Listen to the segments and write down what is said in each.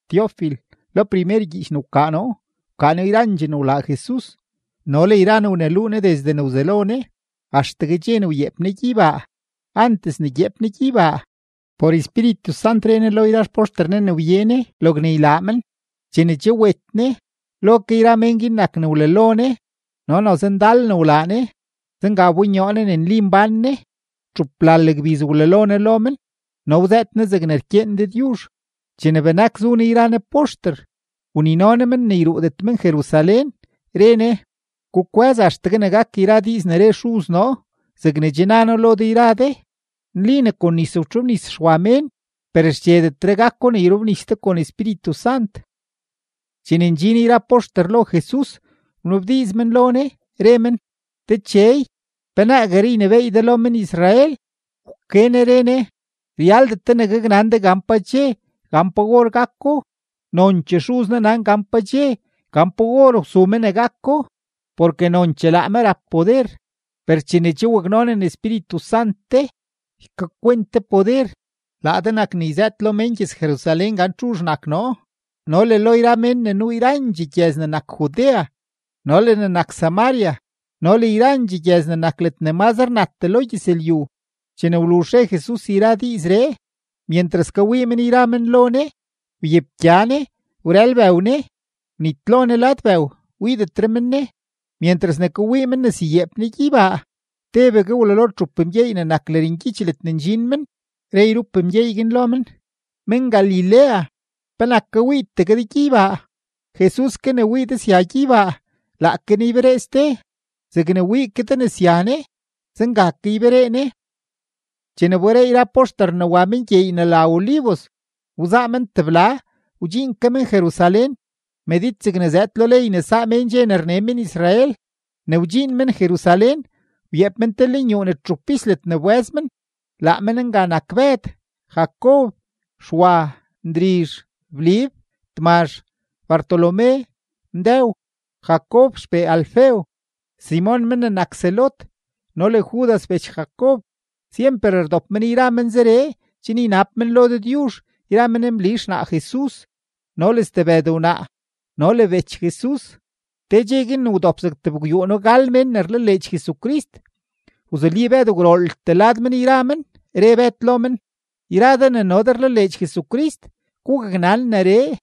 Teofil, lo primer gyiich ne wkaa noo, wkaa noo yrandxee ne wlaa Jesus no le yra ne wneluu Ne desde ne wzelo Ne, axtegue dxe ne wyeep Ne gyeybaa. Antes ne gyeep Ne gyeybaa, por Espíritu Sant re Ne lo yra xpoxter Ne ne wye Ne, logne ylaa men. Chene che wet Ne, lo ke yra men guin nak ne wlalo Ne no noze ndal ne wlaa Ne, zenga wbonyoo Ne ne nli mbán Ne. Txuplal gbiz wlalo Ne lo men no wzëët Ne zegne rkyeen Dëdyuzh. Chene benak zu Ne yra Ne poxter, wnino Ne men ne yruudet men Jerusalén, re Ne: ―Gukwë́z axtegue ne gak yra diiz ne re Xuz noo, zegne che na noo lo de yra de. Nli ne kon nis wtxobnis Xwa mén, per xchedetre gako ne yrobnis de kon Espíritu Sant. Chene ndxin yra poxter lo Jesus, wnabdiiz men lo Ne, re men: ―Dechey, ¿pe naagueree ynebééy de lo men-Israel? Wke Ne re Ne: ―Ryaldet de ne gaknan de gan pa dxe, gan pa or gako; nonchee Xuz noo nan gan pa dxe, gan pa or wsu me ne gako, porke nonchee laa me rap poder. Per chene che waknonen Espíritu Sant de, ykakwent de poder; laa de nak ne yzëët lo mén gyëz-Jerusalén gan txuzh nak noo no le lo yra mén ne nuu yrandxee gyëz ne nak Judea no le ne nak Samaria no le yrandxee gyëz ne nak ledne mazre natdee lo gyëzlyu. Chene wluzh re Jesus yra diizree, myentras kawii men yra men lo Ne, wyepgya Ne wrël bëw Ne, wnitlo Ne lad bëw, wiidetre men Ne. Myentras ne kawii men ne syayeep Ne gyeybaa, tebegue wlalo txup mgyeey ne nak lërngyich ledne ndxin men, re yrup mgyeey guin lo men: ―Men-Galilea, ¿penak kawiitegue de gyeybaa? Jesus ke ne wii de sya gyeybaa, laake Ne yberee ste; zegne wii ke de ne sya Ne, zenga ke yberee Ne. Chene wberee yra poxter ne wa men gyeey ne la Olivos, wzaa men tebla, wdxiin ke men Jerusalén, medid zegne zëëd lo ley ne saa mén dxe ne rne men-Israel. Ne wdxiin men Jerusalén, wyeep men te lenyuu ne txup pis ledne wbë́z men. Laa men nga nak Bëd, Jacob, Xwa, Ndrizh, Blib, Tmazh, Bartolomé, Mdëw, Jacob xpee Alfeo, Simon men ne nak Zelot, no le Judas bech Jacob. Syemper rdop men yra men zeree chen ynab men lo Dëdyuzh yra men Mli xnaa Jesus no le stebëd wnaa no le bech Jesus. Te dxe guin ne wdop zeg tebgwyuuno-gal mén ne rlaleedx Jesucrist, wzuli Bëd gwrooltee lad men yra men, re Bëd lo men: ―Yra de ne no de rlaleedx Jesucrist, gugaknan neree,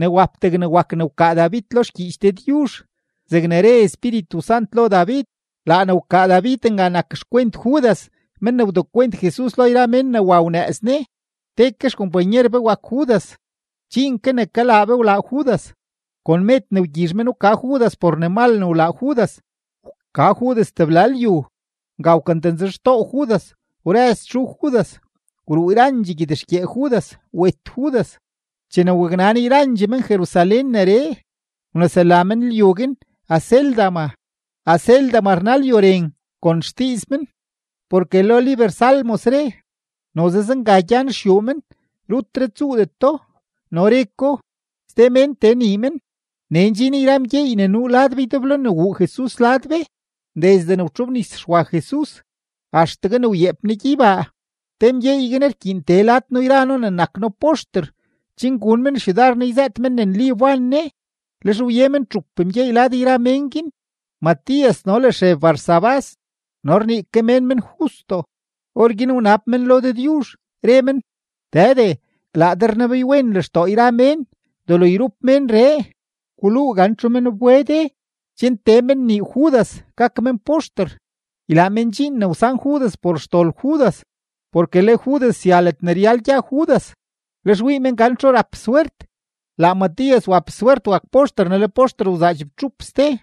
ne wap degne wak ne wkaa David lo xgyiich Dëdyuzh zegne re Espíritu Sant lo David; laa ne wkaa David nga nak xkwent Judas men ne wdekwent Jesus lo yra mén ne wa wanëëz Ne. Te ke xkompanyer be wak Judas, dxiin ke ne kalaa be wlaa Judas. Kon med ne wgyizh men wka Judas por ne mal ne wlaa Judas, wka Judas tebla lyu. Nga wkantanzhextoo Judas, wrëz txu Judas, wruu yrandxee gyed-xgyee Judas, wet Judas. Chene waknan yrandxee men-Jerusalén neree, wnesela men lyu guin Acéldama; Acéldama rna Lyu Ren kon xdiiz men. Porke lo liber Salmos re: Noze zenga gyan xyuu men, rutre tsuudeto. No re ko: Ste mén tee nii men. ’Nee ndxin yra mgyeey ne nuu lad be ydeblo ne wuu Jesus lad be desde ne wtxobnis Xwa Jesus, axtegue ne wyeep Ne gyeybaa. Te mgyeey guin rkyiin tee lad noo yra noo ne nak noo poxter chen gun men xyudar noo ne yzëët noo ne nli wban Ne. Lex wye men txup mgyeey lad yra mén guin: Matías no le Xeb Barsabás no rnii ke mén men Justo. Orguin wnab men lo Dëdyuzh, re men: ―Dëde, laa de rnebeywen lextoo yra mén. Delo yrup ménree, guluu gan txu men wbe de chen tee men nii Judas gak men poxter, ylaa men dxiin ne wsan Judas por xdol Judas, porke le Judas sya ledne ryal gya Judas. Lex wii men gan txu rap swert. Laa Matías wap swert wak poxter ne le poxter wzaa chibtxup ste.